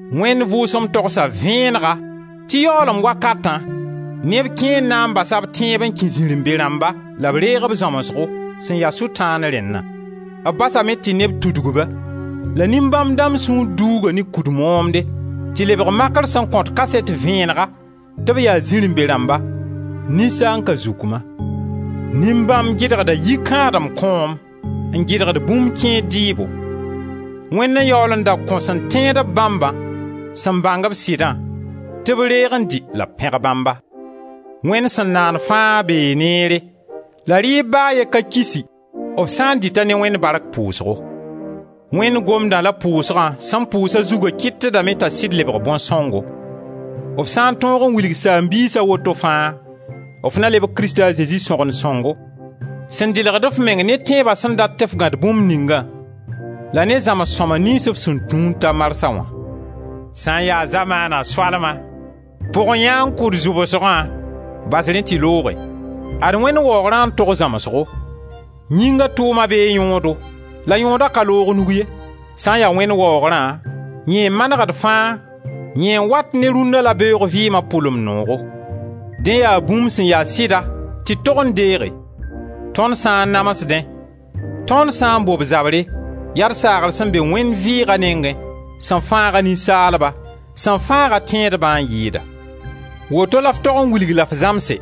Wẽnd Vʋʋsem togsa vẽenega tɩ yaoolem wakatã neb kẽer na n basa b tẽebo n kẽ zirẽ-be-rãmba la b reeg b zãmsgo, sẽn ya Sʋtãan rẽnna. B basame tɩ neb tudg-ba, la nin-bãmb dãmb sũur duuga ne kud moomde, tɩ lebg makr sẽn kõt kaset vẽenega tɩ b yaa zirẽ-be-rãmba, ninsaan-kazukma. Nin-bãmb gɩdgda yikãadem kõom, n gɩdgd bũmb kẽer dɩɩbo. Wẽnd n yaool n da kõ sẽn tẽed-b bãmbã, sẽn bãng-b sɩdã, tɩ b reeg n dɩ la b pẽg Bãmba. Wẽnd sẽn naan fãa bee neere la rɩɩb ba a ye ka kisi, f sã n dɩt-a ne Wẽnd bark pʋʋsgo. Wẽnd Gomdã la pʋʋsgã sẽn pʋʋs a zugã kɩtdame t'a sɩd lebg bõn-sõngo. F sã n tõog n wilg saam-biisa woto fãa, f na lebg Krista a Zezi sõgen sõngo, sẽn dɩlg f meng ne tẽeba sẽn dat tɩ f gãd bũmb ningã, la ne zãms-sõma niyns f sẽn tũ n ta marsã wã. Sã n ya zamaana soalma, pʋg-yãan-kʋd zʋbsgã, bas rẽ tɩ looge. Ad Wẽnd waoogrã n tog zãmsgo. Yĩnga tʋʋma bee yõodo la yõoda ka loog nug ye. Sã n ya Wẽnd waoogrã, yẽ n manegd fãa, yẽ n wat ne rũnna la beoog vɩɩma pʋlem noogo. Dẽ yaa bũmb sẽn ya sɩda tɩ d tog n deege. Tõnd sã n namsdẽ, tõnd sã n bob zabre, yaa d saagr sẽn be Wẽnd vɩɩga nengẽ, sẽn fãaga ninsaalba, sẽn fãaga tẽedbã n yɩɩda. Woto la f tog n wilg la f zãmse.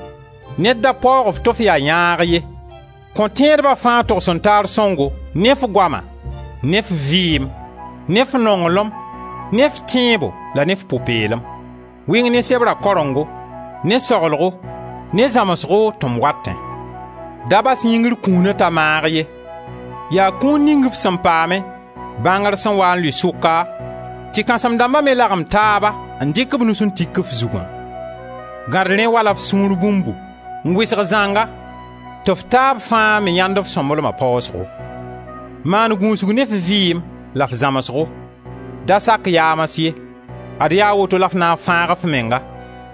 Ned da paoog-f tɩ f yaa yãag ye. Kõ tẽedba fãa togs-n-taar sõngo, ne f goama, ne f vɩɩm, ne f nonglem, ne f tẽebo la ne f pʋ-peelem. Wɩng ne sebra karengo, ne saglgo, ne zãmsgo tɩ m watẽ. Da bas yĩngr kũuna t'a maag ye. Yaa kũun ning f sẽn paame, bãngr sẽn waa n lʋɩ sʋka tɩ kãsem-dãmba me lagem taaba n dɩk b nus n tik f zugã. Gãd rẽ wala f sũur bũmbu n wɩsg zãnga tɩ f taab fãa me yãend f sõmblema paasgo. Maan gũusg ne f vɩɩm la f zãmsgo; da sak yaams ye. Ad yaa woto la f na n fãag f menga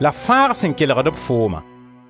la f fãag sẽn kelgd-b fooma.